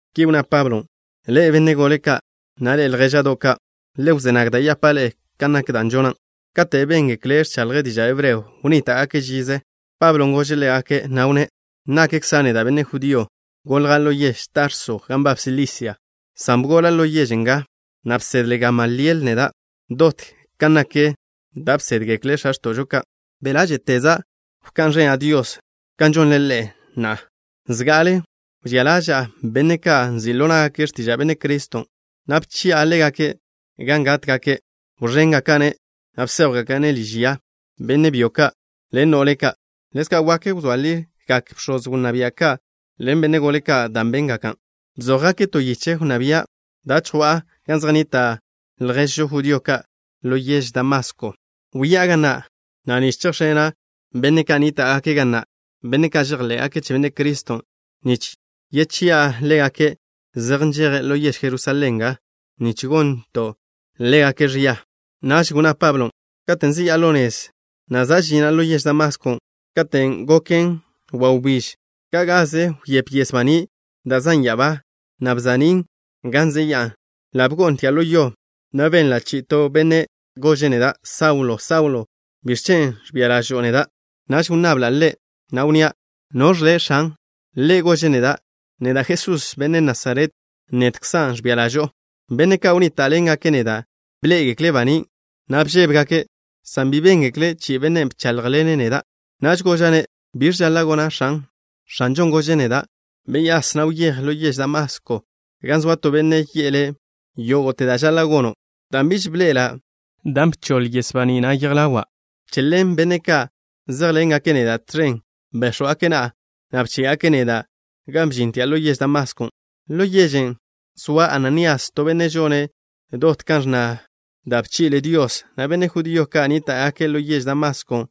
Ki wnná Pablon': —Ḻe'e, benne' gole ka', na' ḻe'e, ljéža'do' ka'. Le wzé nag da' yapa' ḻe'e kan nak da' žona'. Kate' béngekle' ẕchaḻje' diža' hebreo, wnníta'gakže' žize. Pablon' gože' ḻégake', na' wnné': —Nakkza' neda' benne' judío. Golja' ḻo yež Tarso gan nbab Silisia, san bgola' ḻo yež nga, na' bsedle Gamaliel neda' dot kan nak da' bsédgekle x̱a x̱to'žo ka'. Be' ḻáže'teza' bka'n ẕena' Dios kan žonle ḻe'e na'a. Zga'ale wžía ḻaža'a benne' ka' nzi' ḻo ná'gake' x̱tiža' Benne' Criston', na' bchi'a ḻégake' gan gátgake'. Wẕéngaka'-ne', na' bséjwgaka'-ne' liž ya, benne' byo ka' ḻen no'le ka'. Ḻezka' wak wzóa ligak bx̱oz wnná bia' ka' ḻen benne' gole ka' da' béngake'. Bzójgake' to yiche wnná bia' da' chjwa'a gan zej nnita' lježžo judío ka' ḻo yež Damasko. Wyá'a ga na' nich chejx̱ena' benne' ka' nníta'gake' ga na', benne' ka' žejḻé'gake' che Benne' Criston', nich yedjchi'a ḻégake' zej nžeje' ḻo yež Jerusalén nga, nich gonto' ḻégake' ẕia. Naž wnná Pablo: —Katen' zeyá'a ḻo nez, na' za' žina' ḻo yež Damaskon', katen' goken wawbíž, ka' gaze wyép yes baní' da' zan' ya'abá, na' bsa'nín' gan zeyá'a. Ḻa' bgo'ntia' ḻo yo, na' benla' chi'i to Benne' gože' neda': “Saulo, Saulo, ¿biẕ chen' ẕbia ḻažo'o neda'?” Naž wnnabla' Ḻe', na' wnnía': “¿Noẕ Le', X̱an?” Ḻe' gože' neda': “Neda' Jesús, benne' Nasaret. Nedkza' ẕbia ḻažo'o.” Benne' ka' wnníta'ḻengake' neda' bḻé'egekle' banín', na' bžébegake', san bi béngekle' chi'i Bennen' bcháḻjḻene' neda'. Naž goža'-ne': “¿Biẕ žaḻa' gona', X̱an?” X̱anžon' gože' neda': “Beyás, na' wyéj ḻo yež Damasko gan zoa to benne' yi'e le' yógo'te da' žaḻa' gono'.” Dan' biž bi bḻe'ela' dan' bdi'i yes baní' na' yej ḻawa', che ḻen benne' ka' zéjḻengake' neda' tẕen béx̱wgake' na'a, na' bché'gake' neda' gan bžintia' ḻo yež Damaskon'. ’Ḻo yežen' zoa Ananías, to benne' žone' dot kan ẕnna da' bchi'le Dios, na' benne' judío ka' nníta'gake' ḻo yež Damaskon'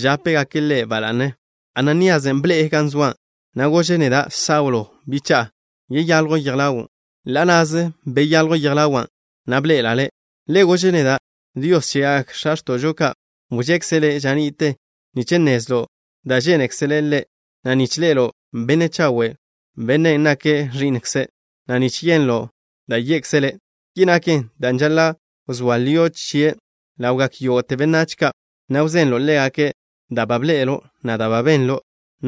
žápegake' ḻe' ba la'ne. Ananíasen' bḻe'e gan wzóa', na' gože' neda': “Saulo, bicha'a, yeyaljw yej ḻawo'.” Ḻa' na'ze beyaljw yej ḻawa', na' bḻe'ela' ḻe'. Ḻe' gože' neda': “Dios chegak x̱a x̱to'žo ka', wžekze' le' ža ni'te nich nnezlo' da' žénekzele' Ḻe', na' nich ḻe'elo' Benne' Chawe', Bennen' nake' Ẕi'nkze', na' nich yenlo' da' ye'kze' le'. Ki naken dan' žaḻa' wzóa lio' chie' Ḻe' ḻawgak yógo'te benách ka', na' wzenlo' ḻégake' da' ba bḻe'elo', na' da' ba benlo'.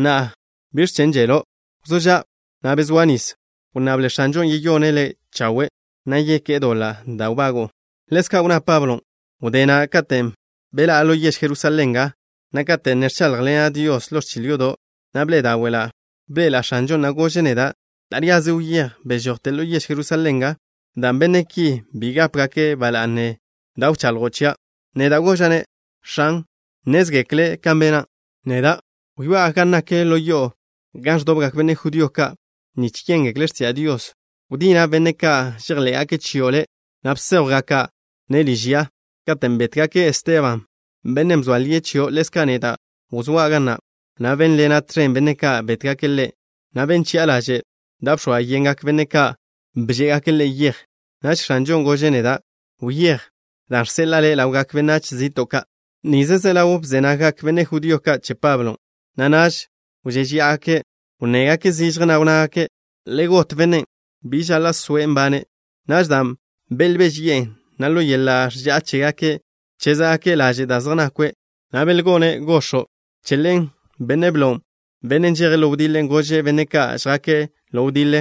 Na'a, ¿biẕ chen' želo'? Wzó ža', na' bezóa nis. Wnnable X̱anžon' yeyone' le' chawe', na' yeké'e doḻa' da' nbago'o.” Ḻezka' wnná Pablo: —Wdé na', katen' beḻá'a ḻo yež Jerusalén nga, na' kate' ne ẕcháḻjḻena' Dios ḻo ẕchil yodo', na' bḻe'e dáwe'la'. Bḻe'ela' X̱anžon', na' gože' neda': “Taríaze wyéj. Bežojte ḻo yež Jerusalén nga, dan' benne' ki bi gápegake' ba la'ne da' wchaḻjo' chia'.” Neda' goža'-ne': “X̱an, nnézgekle' kan bena' neda'. Wyoá'a gan nak ḻo yo'o gan ẕdobgak benne' judío ka' nich yéngekle' x̱tiža' Dios. Wdina' benne' ka' žejḻé'gake' chio' Le', na' bséjwgaka'-ne' liž ya. Katen' bétgake' Esteban, bennen' bzoa lie' chio', ḻezka' neda' wzóa' ga na', na' bénḻena' tẕen benne' ka' bétgake' ḻe', na' ben chi'a laže' da' bx̱oa yengak benne' ka' bžé'egake' ḻe' yej.” Naž X̱anžon' gože' neda': “Wyéj, dan' žseḻa'a le' ḻawgak benách zi'to' ka'.” Nize ze ḻaw bze naggak benne' judío ka' che Pablo, na' naž wžéžeya'agake'. Wnnégake' zižje, na' wnnágake': —Le got bennen'. Bi žaḻa' soe' nbane'. Naž, dan' belbéžeyi'e, na' ḻo yeḻa' ẕža'a chégake', bchézgake' laže' da' zej nakwe', na' belgo'ne' gox̱o', che ḻen benne' blon', bennen' žeje' ḻo wdiḻe, gože' benne' ka' žjake' ḻo wdiḻe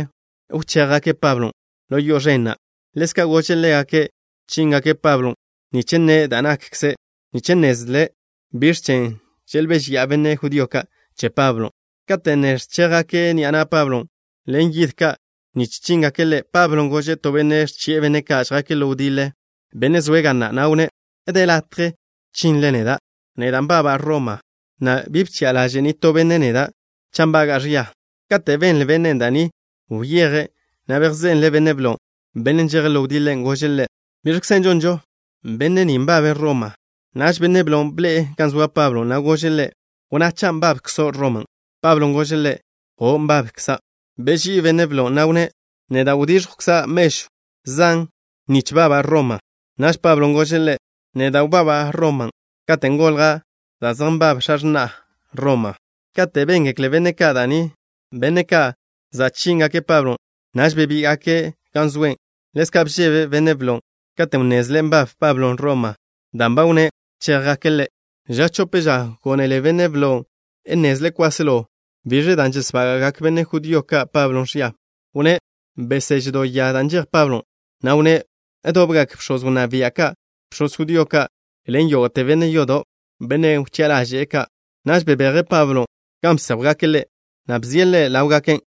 wché'gake' Pablon' ḻo yo'o ẕen na'. Ḻezka' gože' ḻégake' chíngake' Pablon' nich nne' da' nakkzen, nich nnezle' biẕ chen' želbéžeya'a ki benne' judío ka' che Pablon'. Kate' ne ẕchéjgake' ni'a na' Pablon' ḻen yid ka' nich chíngake' ḻe', Pablon' gože' to benne' ẕchi'e benne' ka' žjake' ḻo wdiḻe, benne' zoe' ga na', na' wnné': —¿De latje chinle neda'? Neda' nbaba' Roma, na' bi bchi'a ḻaže' nitó benne' neda' cha' nbaga'a ẕia. Kate' benle bennen' da' ni, wyeje', na' bejzenle' benne' blon', bennen' žeje' ḻo wdiḻe. Gože' ḻe': —¿Biẕkze žonžo? Benne' ni nbabe' Roma. Naž benne' blon' bḻe'e gan zoa Pablon', na' gože' ḻe': —Wnná cha' nbabkzo' Roma. Pablon' gože' ḻe': —O', nbabkza'. Beží'i benne' blon', na' wnné': —Neda' wdíẕjwkza' mežw zan nich baba' Roma. Naž Pablon' gože' ḻe': —Neda' wbaba' Roma katen' golja' dan' zej nbab x̱a x̱na'a Roma. Kate' béngekle benne' ka' da' ni, benne' ka' za' chíngake' Pablon', naž bebíga'gake' gan zoe'. Ḻezka' bžebe benne' blon' katen' wnnezle' nbab Pablon' Roma, dan' ba wnné' wchéjgake' ḻe'. Ža chope ža, gónele benne' blon' nnezle' kwáselo biẕen' da' žesbága'gak benne' judío ka' Pablo ẕia. Wnné' beseže' do yan' da' nžejen Pablon', na' wnné' dobgak bx̱oz wnná bia', bx̱oz judío ka' ḻen yógo'te benne' yodo', benne' wchi'a ḻaže' ka'. Naž bebeje' Pablon' gan bséjwgake' ḻe', na' bzie' ḻe' ḻáwgake'.